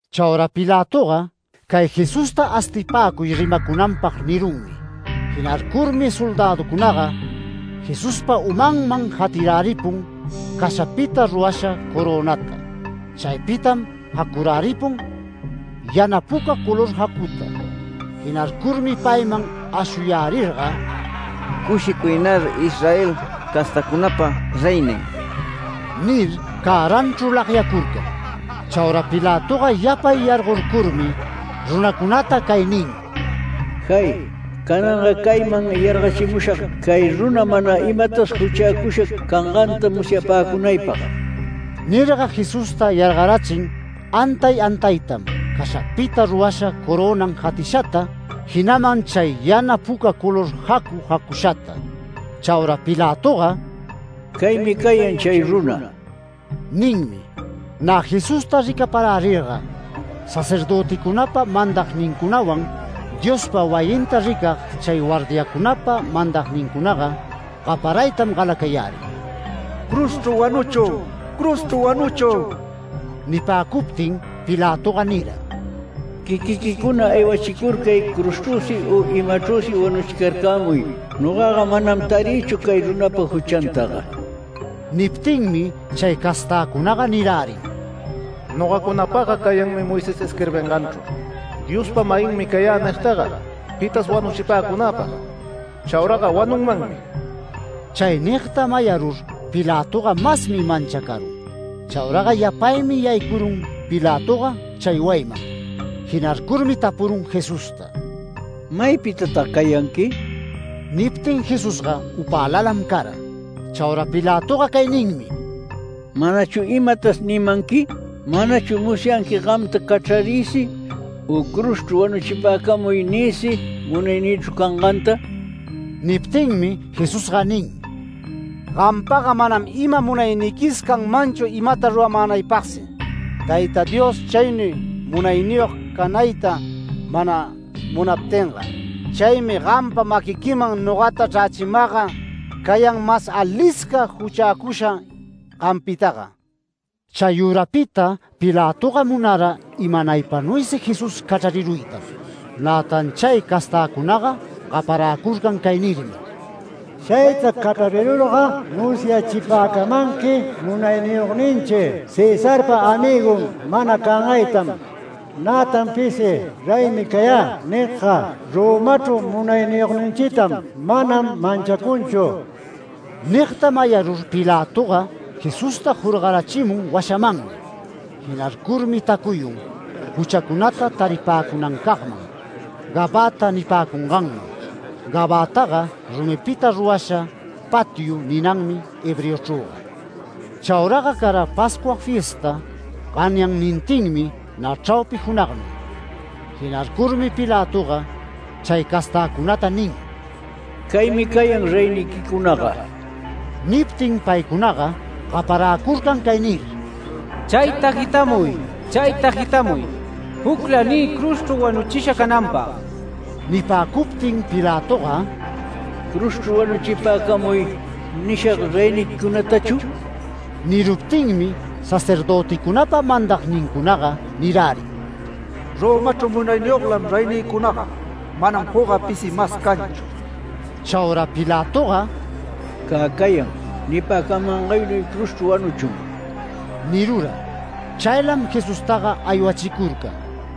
Chaura Pilatoga “Cay Jesusta astipäcuy rimacunanpag” nirunmi. Jinarcurmi soldäducunaga Jesuspa umanman jatiräripun cashapita rurasha corönata. Chaypitam jacuräripun yana puca color jacuta. Jinarcurmi payman ashuyärirga “Cushicuynar Israel castacunapa reynin” nir cäranchru lagyacurcan. Chaura Pilatoga yapay yargorcurmi, runacunata chay nin: “¡Jay! Cananga cayman yargachimushag, cay runa mana imatas juchäcusha canganta musyapäcunaypag”. Nirga Jesusta yargarachin antay antaytam cashapita rurasha corönan jatishata. Jinaman chay yana puca color jacu jacushata. Chaura Pilatoga “Caymi cayan chay runa” ninmi. Nä Jesusta ricaparärirga, sacerdöticunapa mandagnincunawan Diospa wayinta ricag chay guardiacunaga mandagnincunaga gaparaytam galacayärin: “¡Cruzchru wanuchun! ¡Cruzchru wanuchun!” Nipäcuptin Pilatoga nira: “Quiquiquicuna aywachicurcay cruzchrüsi u imachrüsi wanuchicarcämuy. Nogaga manam tarïchu cay runapa juchantaga”. Niptinmi chay castäcunaga nirärin: “Nogacunapagga cayanmi Moisés isquirbinganchru, ‘Diospa-mayinmi cayä’ nigtaga pitas wanuchipäcunäpag. Chauraga wanunmanmi”. Chay nigta mayarur, Pilatoga masmi manchacarun. Chauraga yapaymi yaycurun Pilatoga chay wayiman. Jinarcurmi tapurun Jesusta: “¿Maypitatag cayanqui?” Niptin Jesusga upälalam cara. Chaura Pilatoga cay ninmi: “¿Manachu imatas nimanqui? ¿Manachu musyanqui gamta ‘Cachrariysi’ u ‘Cruzchru wanuchipäcamuy’ niysi munaynïchru canganta?” Niptinmi Jesusga nin: “Gampaga manam ima munayniquis canmanchu imata ruramänaypagsi, Tayta Dios chaynuy munayniyog canayta mana munaptinga. Chaymi gampa maquiquiman nogata chrächimagga cayan mas alisca juchäcusha gampitaga”. Chayürapita Pilatoga munara imanaypanuysi Jesús cachrariruytam. Nätan chay castäcunaga gaparäcurcan cay nirmi: “Chayta cachrarirurga musyachipäcamanqui munayniyogninchi Cesarpa amïgun mana cangaytam. Nätan pisi ‘Reymi cayä’ nigga Romachru munayniyogninchitam mana manchacunchu”. Nigta mayarur Pilatoga Jesusta jorgarachimun washamanmi. Jinarcurmi tacuyun juchacunata taripäcunancagman, ‘Gabata’ nipäcunganman. ‘Gabataga’ ‘Rumipita rurasha patiu’ ninanmi hebreochrüga. Chauraga cara Pascua fiesta ganyannintinmi nä chraupi junagnuy. Jinarcurmi Pilatoga chay castäcunata nin: “Caymi cayan reyniquicunaga”. Niptin paycunaga gaparäcurcan cay nir: “¡Chayta jitamuy! ¡Chayta jitamuy! ¡Jucla niy cruzchru wanuchisha cananpag!” Nipäcuptin Pilatoga “ ‘Cruzchru wanuchipäcamuy’ ¿nishag reyniquicunatachu?” Niruptinmi sacerdöticunapa mandagnincunaga nirärin: “Romachru munayniyoglam reynïcunaga. Manam jucga pisi mas canchu”. Chaura Pilatoga “Cä cayan. Nipäcamangaynuy cruzchru wanuchun” nirura. Chaylam Jesustaga aywachicurcan.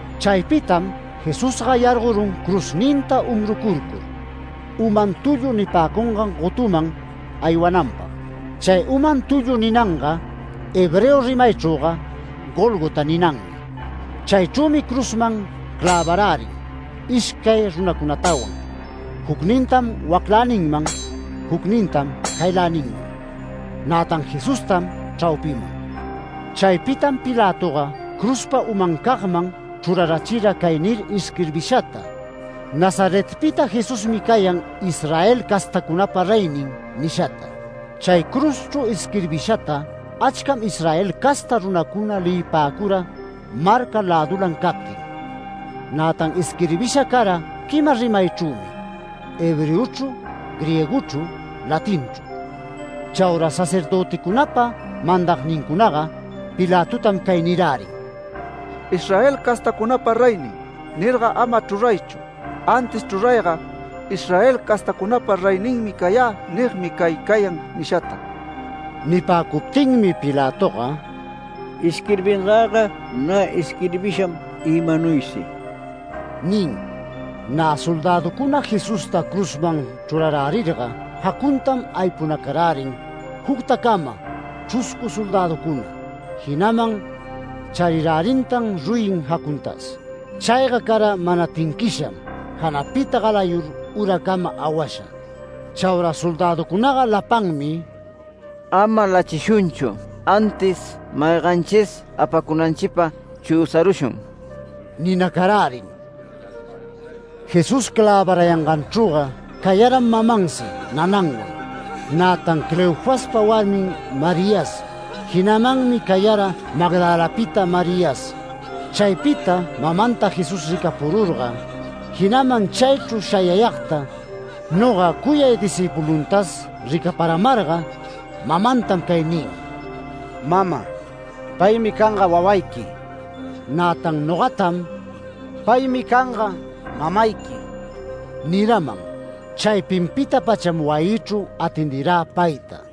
Chaypitam Jesusga yargorun cruzninta umrucurcur, ‘Uman tullu’ nipäcungan gotuman aywananpag. Chay ‘Uman tullu’ ninanga hebreo rimaychrüga ‘Gólgota’ ninanmi. Chaychrümi cruzman clävarärin ishcay runacunatawan, jucnintam wacläninman jucnintam cayläninman, nätan Jesustam chraupiman. Chaypitam Pilatoga cruzpa umancagman chrurarachira cay nir isquirbishata “NAZARETPITA JESUSMI CAYAN ISRAEL CASTACUNAPA REYNIN” nishata. Chay cruzchru isquirbishata achcam Israel casta runacuna leyipäcura marca lädulan captin. Nätan isquirbisha cara quima rimaychrümi, hebreochru, griegochru, latinchru. Chaura sacerdöticunapa mandagnincunaga Pilatotam cay nirärin: “ ‘Israel castacunapa reynin’ nirga ama chruraychu, antis chrurayga ‘Israel castacunapa reyninmi cayä nigmi cay cayan’ nishata”. Nipäcuptinmi Pilatoga “Isquirbingäga nä isquirbisham imanuysi” nin. Nä soldäducuna Jesusta cruzman chrurarärirga, jacuntam aypunacarärin juctacama chruscu soldäducuna. Jinaman charirärintan ruyin jacuntas. Chayga cara mana tinquisham, janapita galayur uracama awasha. Chaura soldäducunaga lapanmi “Ama lachishunchu, antis mayganchis apacunanchipag chüsarushun” ninacarärin. Jesús clävarayangancagchrüga cayaram mamansi nananwan, nätan Cleofaspa warmin Marias, jinamanmi cayara Magdalapita Marias. Chaypita mamanta Jesús ricapururga, jinaman chaychru shayayagta noga cuyay discïpuluntas ricaparamarga, mamantam cay nin: “Mama, paymi canga wawayqui”. Nätan nogatam “Paymi canga mamayqui” niraman. Chaypinpita-pacham wayïchru atendirä payta.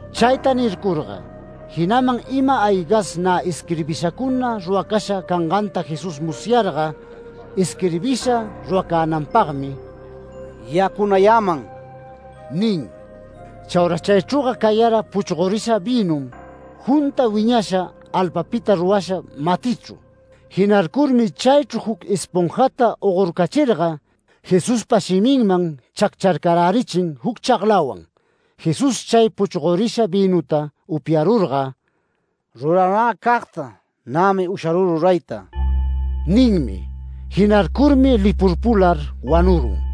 Chayta nircurga, jinaman ima-aygas nä isquirbishacuna ruracasha canganta Jesús musyarga, isquirbisha ruracänanpagmi “Yacunayäman” nin. Chaura chaychrüga cayara puchgorisha vïnum junta wiñasha alpapita rurasha matichru. Jinarcurmi chaychru juc esponjata ogorcachirga Jesuspa shiminman chaccharcarärichin juc chaglawan. Jesús chay puchgorisha vïnuta upyarurga “Ruranäcagta nämi usharü rurayta” ninmi. Jinarcurmi lipurpular wanurun.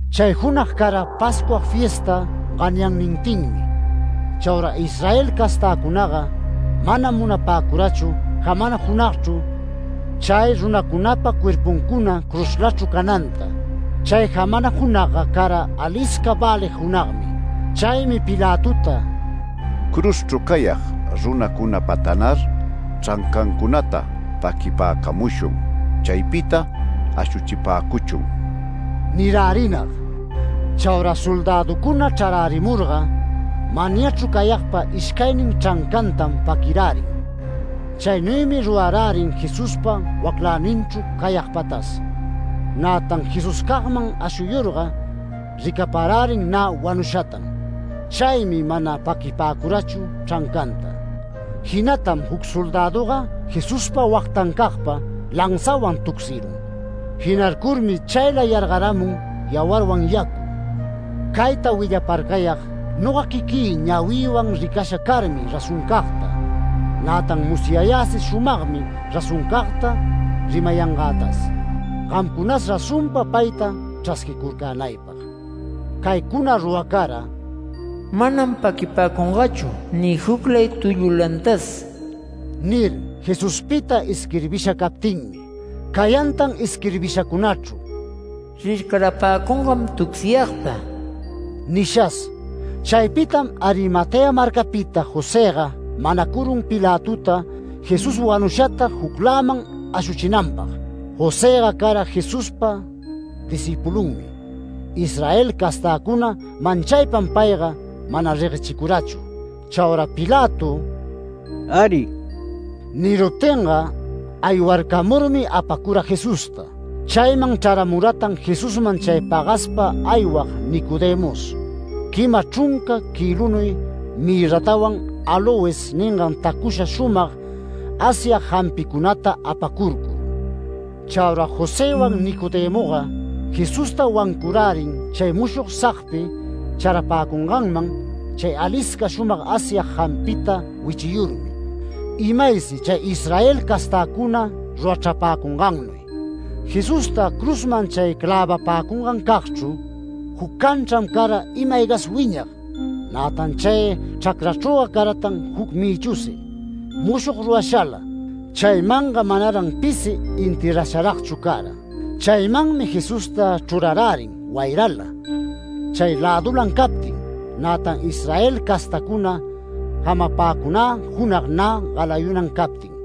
Chay junag cara Pascua fiesta ganyannintinmi. Chaura Israel castäcunaga manam munapäcurachu jamana junagchru chay runacunapa cuerpuncuna cruzlachru cananta. Chay jamana junagga cara alisca välig junagmi. Chaymi Pilatota “Cruzchru cayag runacunapatanar chrancancunata paquipäcamuchun. Chaypita ashuchipäcuchun” nirärinag. Chaura soldäducuna chrarärimurga manyachru cayagpa ishcaynin chrancantam paquirärin. Chaynuymi rurarärin Jesuspa wacläninchru cayagpatas. Nätan Jesuscagman ashuyurga ricaparärin nä wanushatam. Chaymi mana paquipäcurachu chrancanta. Jinatam juc soldäduga Jesuspa wagtancagpa lanzawan tucsirun. Jinarcurmi chayla yargaramun yawarwan yacu. Cayta willaparcayag noga quiquï ñawïwan ricasha carmi razoncagta. Nätan musyayäsi shumagmi razoncagta rimayangätas, gamcunas razonpa payta chrasquicurcänaypag. Caycuna ruracara “Manam paquipäcungächu ni juclay tullulantas” nir, Jesuspita isquirbisha captinmi. Cayantan isquirbishacunachru “Rircarapäcungam tucsiyagta” nishas. Chaypitam Arimatea marcapita Josëga manacurun Pilatota Jesús wanushata jucläman ashuchinanpag. Josëga cara Jesuspa discïpulunmi, Israel castäcuna manchaypam payga mana reguechicurachu. Chaura Pilato “Äri” niruptinga aywarcamurmi apacura Jesusta. Chayman chraramuratan Jesusman chay pagaspa aywag Nicodemos, quima chrunca kïlunuy mirratawan áloes ningan tacusha shumag asyag jampicunata apacurcur. Chaura Josëwan Nicodemoga Jesusta wancurärin, chay mushog sagpi charapäcunganman chay alisca shumag asyag jampita wichiyurmi, imaysi chay Israel castäcuna rurachrapäcungannuy. Jesusta cruzman chay clävapäcungancagchru juc canchram cara ima-aygas wiñag. Nätan chay chracrachrüga caratan juc mïchusi, mushog rurashala. Chaymanga manaran pisi enterrasharagchu cara. Chaymanmi Jesusta chrurarärin wayrala, chay lädulan captin, nätan Israel castacuna jamapäcunä junag nä galayunan captin.